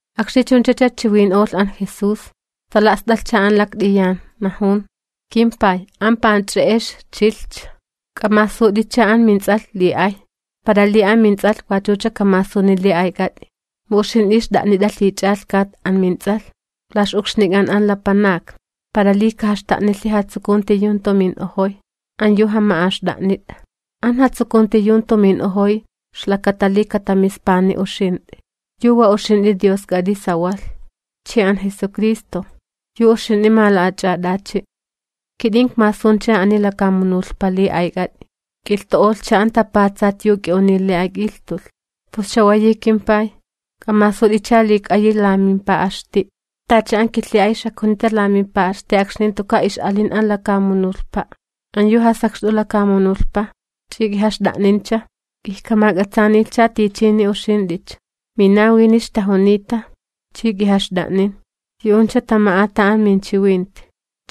Akxni chunchacha chiwin'olh an Jesús, tala'st'alhcha an lakt'iyan, najun: ―KimPay, an panch'e'ex chilhcha. K'amasut'icha aminTs'alh li ay, para li aminTs'alh wachucha kamasuni li ayk'at'i. Mu uxint'i xt'a'nit'a lhich'alhkat aminTs'alh la ix'ukxnik'an an lapanakni, para li kajaxta'nilhi jatsukunti yu jantu min'ojoy an yu jama'axt'a'nit'a. An jatsukunti yu jantu min'ojoy ixlakata li katamispani uxint'i, yu wa uxint'i Diosk'at'i sawalh, chi an Jesucristo, yu uxint'i mala'ach'at'achi'. ’Kit'in ikmasuncha ani lakamunulhpa li ayk'at'i, ik'ilhtu'olhcha an tapatsat yu k'i'uniy li ak'ilhtulh. Pus chawayi kimPay, k'amasut'icha li ik'ayi la mimpa'xti', tacha an kilhi'ay xakjunita la mimpa'xti akxni jantuka' ix'alin an lakamunulhpa'. ’An yu jasakxt'u lakamunulhpa ch'i k'ijaxt'a'nincha, ijkamak'atsaanilhcha tichini uxint'icha. Minawini ixtajunita, chi k'ijaxt'a'nin, yu'uncha tama'ata an minchiwinti.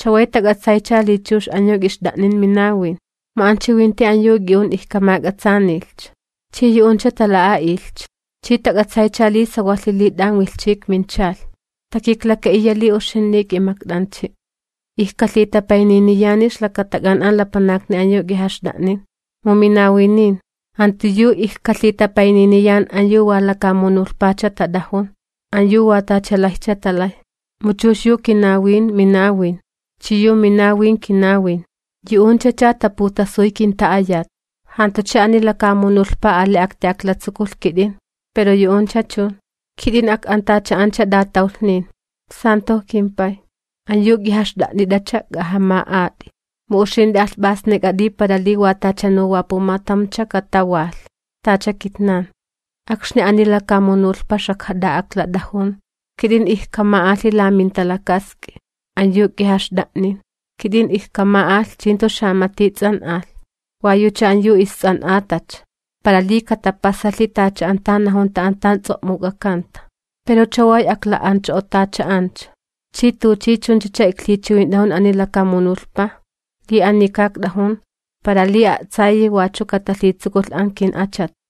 Chaway tak'atsaycha li chux an yu k'ixt'a'nin minawin, mu an chiwinti an yu k'i'un ijk'amak'atsaanilhcha, chi yu'uncha tala'a'ilhcha, chi tak'atsaycha li sawalhi li t'an wilhchi ikminchalh, takiklaka'iya li uxint'i k'imakt'anchi'. ’Ijkalhitapayniniyani ixlakatak'an an lapanakni an yu k'ijaxt'a'nin, mu minawinin, jantu yu ijkalhitapayniniyan an yu wa lakamunulhpacha tat'ajun, an yu wa tachalayjcha talay. Mu chux yu kinawin, minawin, chi yu minawin, kinawin, yu'unchacha taputasuy kinta'ayat. ’Jantucha ani lakamunulhpa ali akti'aklatsukulh kit'in, pero yu'uncha chun, kit'in ak'antacha'ancha t'atawlhnin. Stalan'ak'at'i kimPay, an yu k'ijaxt'a'nit'acha k'ajama'at'i, mu uxint'i alhp'asnik'at'i, para li tachanu wa pumatamcha katawalh, tacha kitnan. Akxni ani lakamunulhpa xajkat'a'aklat'ajun, kit'in ijkama'alhi la minta'a'ut an yu k'ijaxt'a'nin. Kit'in ijkama'alh chi jantu xamati ts'an'alh, wa yucha an yu ists'an'atacha, para li katapasalhi tacha an najunta an tan ts'o'muk'akanta. ’Pero chaway akla'ancho'otacha'ancha, chi tuchi chunchacha iklhichiwint'ajun ani lakamunulhpa li anika ikt'ajun, para li a'tsayi katalhitsukulh wachu an ki'achat.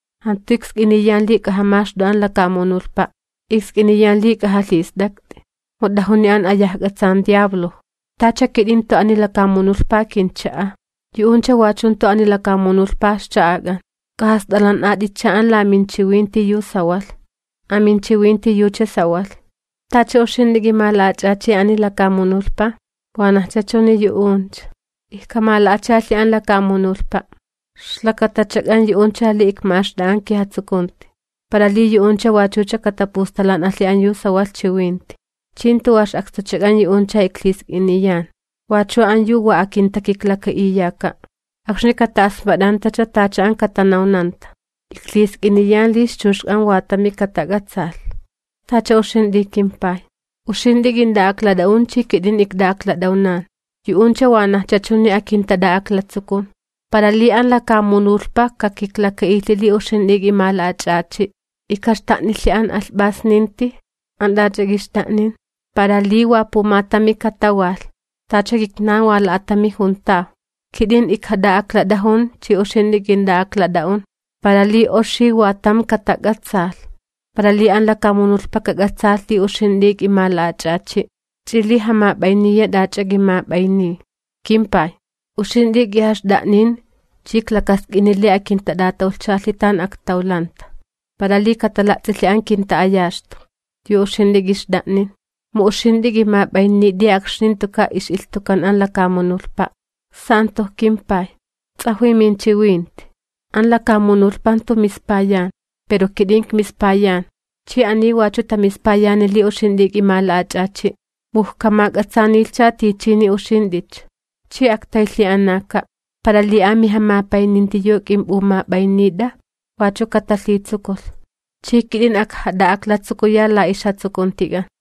Jantu iksk'iniyan li k'ajamaxt'u an lakamunulhpa', iksk'iniyan li k'ajalhist'akt'i, mu t'ajuni an ayajk'atsan xapay makxkay'un. Tacha kit'in jantu ani lakamunulhpa kincha'a, yu'uncha wachu jantu ani lakamunulhpa ixcha'ak'an. K'ajast'alan'at'icha an la minchiwinti yu sawalh, aminchiwinti yucha sawalh. Tacha uxint'i k'imala'ach'achi ani lakamunulhpa, wanajcha chuni yu'uncha, ijkamala'achalhi an lakamunulhpa'. Ixlakatachak'an yu'uncha li ikma'axt'a'a an kijatsukunti, para li yu'uncha wachucha katapustalan'alhi an yu sawalh chiwinti. ’Chi jantu wa ix'akstuchak'an yu'uncha iklhisk'iniyan, wachu an yu wa akintakiklaka'iyaka', akxni kata'asmat'antacha tacha an katanawnanta. Iklhisk'iniyan li ixchuxk'an wa tami katak'atsaalh, tacha uxint'i kimPay, uxint'i k'int'a'aklat'a'un chi kit'in ikt'a'aklat'awnan, yu'uncha wanajcha chuni akintat'a'aklatsukun, para li an lakamunulhpa kakiklaka'ilhi li uxint'i k'imala'ach'achi'. Ijkaxta'nilhi an alhp'asninti an t'ach'a k'ixt'a'nin, para li wa pumatami katawalh, tacha kitnan wa pumatami juntaw. Kit'in ijkat'a'aklat'ajun chi uxint'i k'int'a'aklat'a'un, para li oxi wa tam katak'atsaalh, para li an lakamunulhpa kak'atsaalhi li uxint'i k'imala'ach'achi', ch'i li jamap'ayniya t'ach'a k'imap'ayniy. ’KimPay, uxint'i k'ijaxt'a'nin chi iklakask'ini li akintat'atawlhchalhi tan aktawlanta, para li katala'ts'ilhi an kinta'ayaxtu yu uxint'i k'ixt'a'nin. Mu uxint'i k'imap'aynit'i akxni jantuka' ix'ilhtukan an lakamunulhpa'. Stalan'ak'at'i kimPay, ts'ajwi minchiwinti, an lakamunulhpa jantu mispayan, pero kit'in ikmispayan, chi ani wachu tamispayani li uxint'i k'imala'ach'achi'. Mu ijkamak'atsaanilhcha tichini uxint'icha, chi aktaylhi'anaka', para li amijamapayninti yu k'imp'umap'aynit'a wachu katalhitsukulh, chi kit'in ajkat'a'aklatsukuya la ixjatsukuntik'an.